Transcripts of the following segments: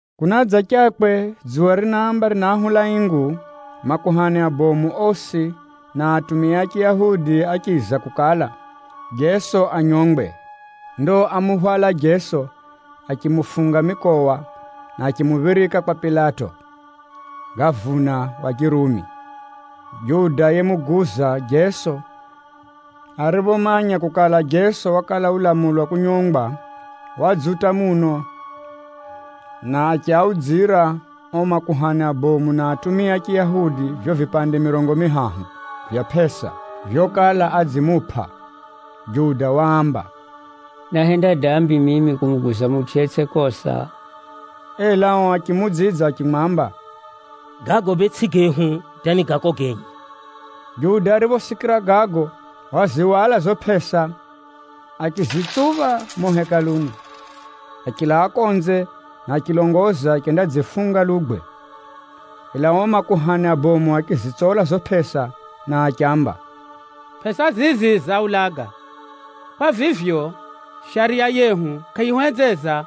Kunadzachakwe dzuwa rinaamba rinaahula ingu, makuhani abomu osi na atumia a Chiyahudi áchiza kukala, Jeso anyongwe. Ndo ámuhwala Jeso achimufunga mikowa, na achimuphirika kwa Pilato, gavuna wa Chirumi. Juda yemuguza Jeso ariphomanya kukala, Jeso wakala ulamulwa kunyongwa, wadzuta muno na achiaudzira o makuhani abomu na atumia a Chiyahudi vivyo vipande mirongo mihahu vya pʼesa vyokala adzimupʼa. Juda waamba, “Náhenda dambi mimi kumuguza mutʼu yetsʼi kosa.” Ela ao achimuudzidza achimwamba, “Gago bee tsʼi gehu hata ni gako genye.” Juda ariphosikira gago, wazihwala zizo pʼesa achizitsupha mumo Hekaluni, achilaa konze na achilongoza achendadzifunga lugwe. Ela ao makuhani abomu achizitsola zizo pʼesa, na achiamba, “Pʼesa zizi zaulaga. Kwa vivyo, Shariya yehu kʼayihuhenzeza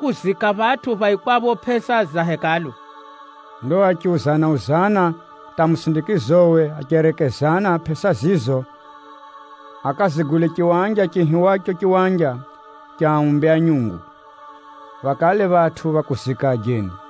kuziika phatʼu phaikwapho pʼesa za Hekalu.” Ndo achiuzana-uzana hata musindikizowe, acherekezana pʼesa zizo akazigule chiwanja chiihiwacho Chiwanja cha Aumbi a Nyungu, phakale phatʼu pha kuzika ajeni.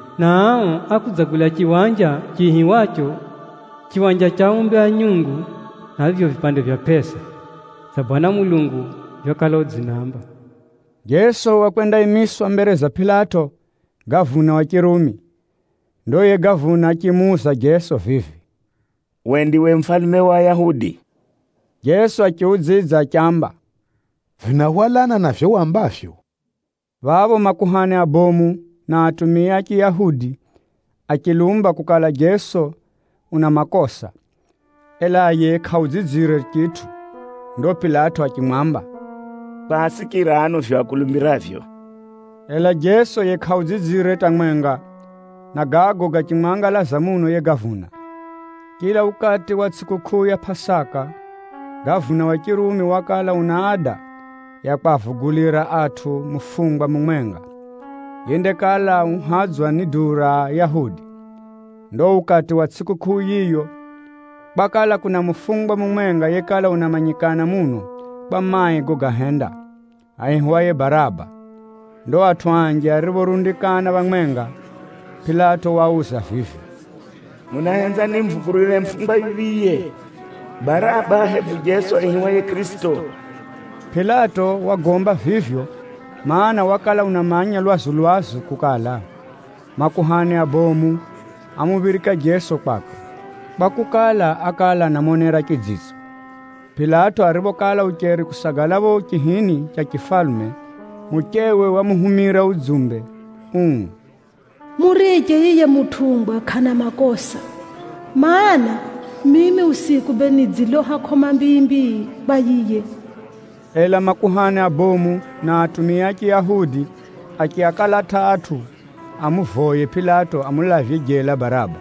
na ao ákudzagula chiwanja chiihiwacho Chiwanja cha Aumbi a Nyungu na vivyo vipande vya pʼesa, dza Bwana Mulungu vyokala udzinaamba.” Jeso wakwendaimiswa mbere za Pilato, gavuna wa Chirumi. Ndo yiye gavuna achimuuza Jeso vivi, “Uwe ndiwe mufalume wa Ayahudi?” Jeso achiudzidza achiamba, “Vinahwalana na vivyo wambavyo.” Phapho makuhani abomu na atumia a Chiyahudi achilumba kukala Jeso una makosa, ela yiye kʼaudzidzire chitʼu. Ndo Pilato achimwamba, “Kʼwasikira ano vivyo akulumbiravyo?” Ela Jeso yiye kʼaudzidzire hata mwenga, na gago gachimwangalaza muno yiye gavuna. Chila ukati wa tsʼikukʼuu ya Pʼasaka, gavuna wa Chirumi wakala una ada ya kwavugulira atʼu mufungwa mumwenga, yendakala uhadzwa ni duu ra Ayahudi. Ndo ukati wa tsʼikukʼuu yiyo, kwakala kuna mufungwa mumwenga yekala unamanyikana muno kwa mai gogahenda, aihiwaye Baraba. Ndo atʼu anji ariphorundikana phamwenga, Pilato waauza vivi, “Munahenza nimuvugulire mufungwa yuphiye, Baraba, hebu Jeso aihiwaye Kʼirisito?” Pilato wagomba vivyo, mana, wakala unamanya lwazu-lwazu kukala, makuhani abomu ámuphirika Jeso kwakwe, kwakukala, ákala anamonera chidzitso. Pilato ariphokala ucheri kusagala phapho chihini cha chifalume, muchewe wamuhumira udzumbe uu, “Muriche yiye mutʼungwa kʼana makosa, mana, mimi usiku bee nidziloha kʼoma mbii-mbii kwa yiye.” Ela makuhani abomu na atumia a Chiyahudi achiakalata atʼu amuvoye Pilato amulavye jela Baraba,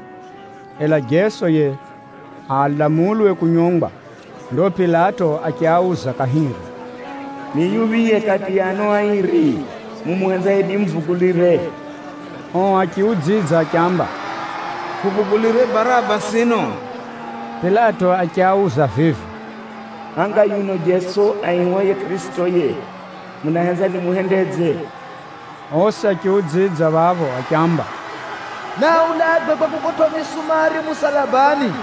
ela Jeso yiye alamulwe kunyongwa. Ndo Pilato achiauza kahiri, “Ni yuphiye kati ya ano airi mumuhenzaye nimuvugulire?” Ao achiudzidza achiamba, “Huvugulire Baraba sino!” Pilato achiauza vivi, “Hanga yuno Jeso aihiwaye Kʼirisito yiye, munahenza nimuhendedze?” Osi achiudzidza phapho achiamba, “Naaulagwe kwa kukotwʼa misumari musalabani!”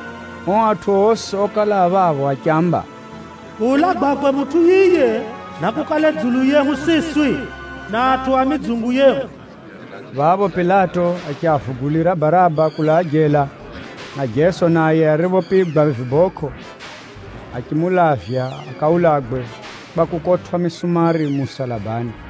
Ao atʼu osi okala a phapho achiamba, “Kuulagwakwe mutʼu yiye, nakukale dzulu yehu siswi, na atʼu a midzungu yehu!” Phapho Pilato achiavugulira Baraba kulaa jela, na Jeso naye ariphopigwa vibokʼo, achimulavya akaulagwe kwa kukotwʼa misumari musalabani.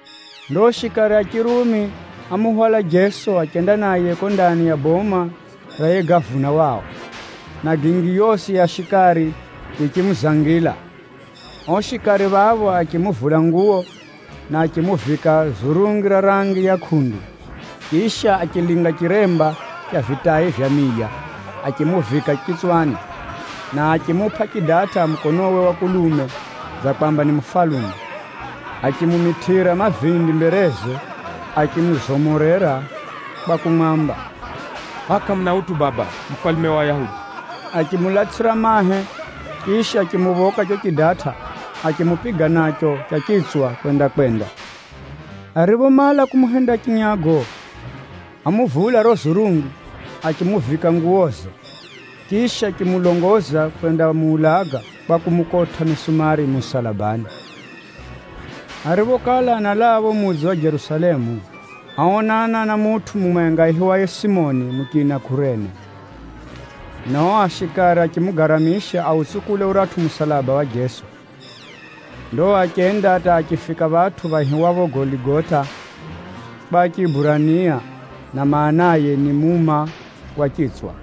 Ndo shikari a Chirumi ámuhwala Jeso achenda naye kuko ndani ya boma ra yiye gavuna wao, na gingi yosi ya shikari yichimuzangila. Ao shikari phapho achimuvula nguwo, na achimuvika zurungi ra rangi ya kʼundu. Chisha, achilinga chiremba cha vitai vya miya, achimuvika chitswani, na achimupʼa chidatʼa mukonowe wa kulume dza kwamba ni mufalume. Achimumitʼira mavindi mbereze, achimuzomorera kwa kumwamba, “Hʼaya kʼamuna utʼu baba mufalume wa Ayahudi?” Achimulatsʼira mahe, chisha, achimuphoka chicho chidatʼa, achimupiga nacho cha chitswa kwenda-kwenda. Ariphomala kumuhenda chinyago, ámuvula riro zurungi, achimuvika nguwoze, chisha achimulongoza kwendamuulaga kwa kumukotʼa misumari musalabani. Ariphokala analaa phapho mudzi wa Jerusalemu, áonana na mutʼu mumwenga aihiwaye Simoni muchina Kurene, na ao shikari achimugaramisha autsukule uratʼu musalaba wa Jeso. Ndo achenda hata achifika phatʼu phaihiwapho Goligota kwa Chiburania, na maanaye ni, “Muma wa Chitswa.”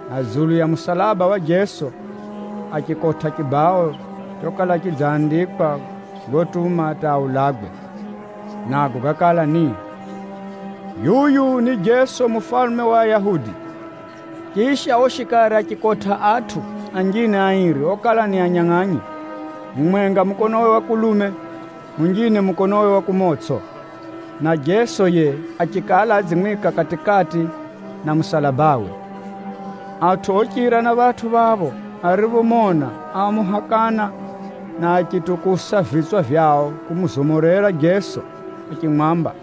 Na dzulu ya musalaba wa Jeso, achikotʼa chibao chokala chidzandikwa gotuma hata aulagwe. Nago gákala ni, “yuyu ni jeso mufalume wa ayahudi.” Chisha, ao shikari achikotʼa atʼu anjine airi okala ni anyangʼanyi, mumwenga mukonowe wa kulume, munjine mukonowe wa kumotsʼo, na Jeso yiye achikala adzimwika kati-kati na musalabawe. Atʼu ochira na phatʼu phapho ariphomona, ámuhakana na achitukusa vitswa vyao kumuzomorera Jeso achimwamba,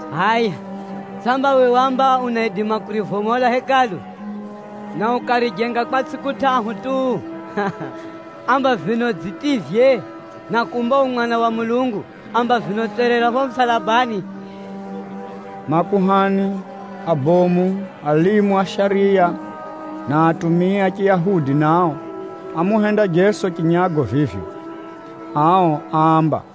“Hʼaya, samba uwe waamba unaidima kurivomola Hekalu, na ukarijenga kwa tsʼiku tʼahu tu? Amba vino dzitivye! Na kumba u Mwana wa Mulungu, amba vino tserera phapho musalabani!” Makuhani abomu, alimu a shariya na atumia a Chiyahudi nao, ámuhenda Jeso chinyago vivyo. Ao áamba,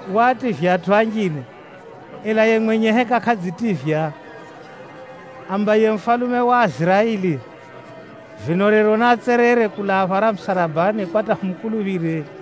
“Waativya atʼu anjine, ela yiye mwenye heka kʼadzitivya? Amba yiye mufalume wa Aiziraeli, vino rero naatserere kulaa phara musalabani kwa hata humukuluphire.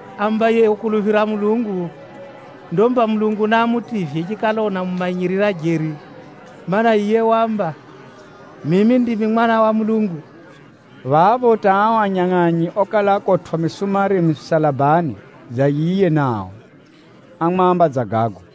Amba yiye ukuluphira Mulungu! Ndo mba Mulungu naamutivye chikala unamumanyirira jeri, mana, yiye waamba, ‘Mimi ndimi Mwanangwa wa Mulungu.’” Phapho hata ao anyangʼanyi okala akotwʼa misumari misalabani dza yiye nao, ámwamba dza gago.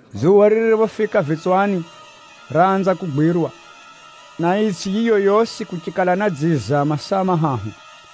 Dzuwa ririphofika vitswani raanza kugwirwa, na itsʼi yiyo yosi kuchikala na dziza masaa mahahu.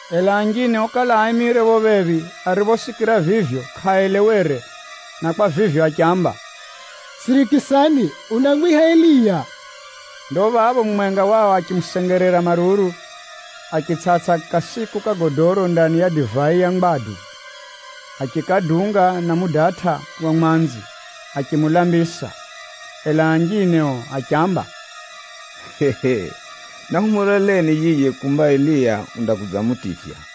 Ela anjine okala aimire phapho phephi ariphosikira vivyo kʼaaelewere, na kwa vivyo achiamba, “Sirikisani, unamwiha Eliya!” Ndo phapho mumwenga wao achimusengerera maruru, achitsʼatsʼa kasiku ka godoro ndani ya divai ya ngwadu, achikadunga na mudatʼa wa mwanzi achimulambisa. Ela anjine ao achiamba, “Nahumuloleni yiye kumba Eliya undakudzamutivya.”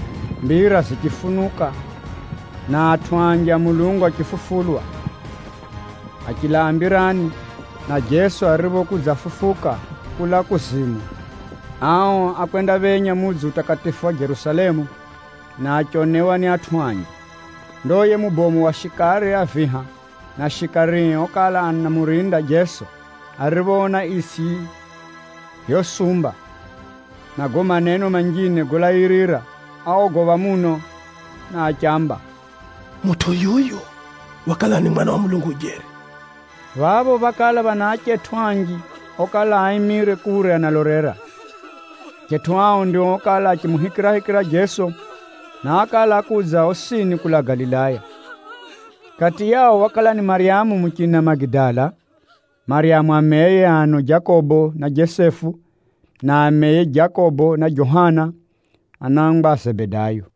mbira zichifunuka, na atʼu anji a Mulungu achifufulwa, achilaa mbirani. Na Jeso ariphokudzafufuka kulaa kuzimu, ao ákwendaphenya mudzi utakatifu wa Jerusalemu, na achionewa ni atʼu anji. Ndo yiye mubomu wa shikari a viha, na shikarie okala anamurinda Jeso ariphoona itsʼi vyosumba na gago maneno manjine golairira, áogopha muno, na achiamba, “Mutʼu yuyu wakala ni Mwana wa Mulungu jeri!” Phapho phákala phana achetʼu anji okala aimire kure analolera. Achetʼu ao ndio okala achimuhikirahikira Jeso, na ákala ákudza osini kulaa Galilaya. Kati yao wakala ni Maryamu muchina Magidala, Maryamu ameye ano Jakobo na Jesefu, na ameye Jakobo na Johana anangwa a Zebedayo.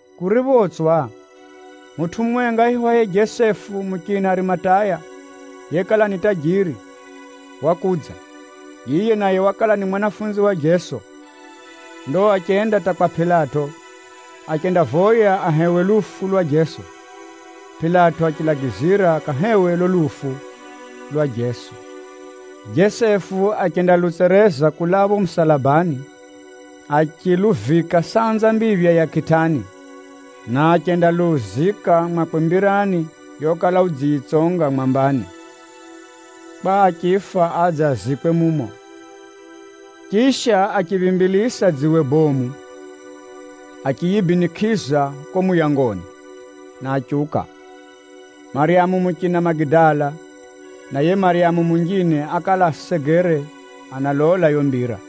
Kuriphotswa, mutʼu mumwenga aihiwaye Jesefu muchina Arimataya yekala ni tajiri, wakudza. Yiye naye wakala ni mwanafunzi wa Jeso. Ndo achenda hata kwa Pilato, achendavoya ahewe lufu lwa Jeso. Pilato achilagizira akahewe lulo lufu lwa Jeso. Jesefu achendalutsereza kulaa phapho musalabani, achiluvika sanza mbiphya ya kitani, na achendaluzika mwakwe mbirani yokala udziyitsonga mwambani, kwa achifa adze azikwe mumo. Chisha, achiphimbilisa dziwe bomu achiyibinikʼiza kuko muyangoni, na achiuka. Maryamu muchina Magidala, na yiye Maryamu munjine ákala asegere analola yiyo mbira.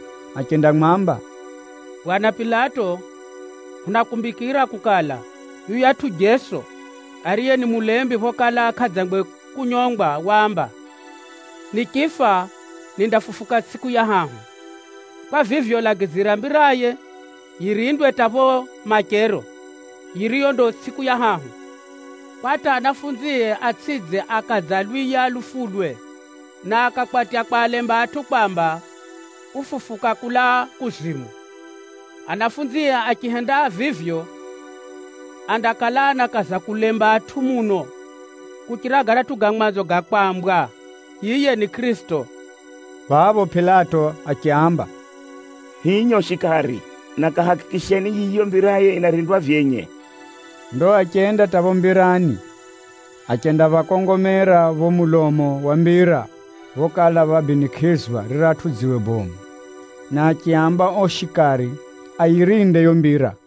achendamwamba, “Bwana Pilato, hunakumbikira kukala yuyatʼu Jeso, ariye ni mulembi phokala kʼadzangwe kunyongwa, waamba, ‘Nichifa, nindafufuka tsʼiku ya hahu.’ Kwa vivyo, lagizira mbiraye yirindwe hata phapho machero, yiriyo ndo tsʼiku ya hahu, kwa hata anafunzie atsʼidze akadzalwiya lufulwe, na akakwatya kwalemba atʼu kwamba, ‘Ufufuka kulaa kuzimu!’ Anafunzie achihenda vivyo, andakala anakaza kulemba atʼu muno kuchira garatʼu ga mwanzo ga kwambwa yiye ni Kʼirisito.” Phapho Pilato achiaamba, “Hinyo shikari, na kahakikisheni yiyo mbiraye yinarindwa vyenye.” Ndo achenda hata phapho mbirani, achenda phakongomera phapho mulomo wa mbira phokala phabinikʼizwa riratʼu dziwe bomu, na achiaamba ao shikari ayirinde yiyo mbira.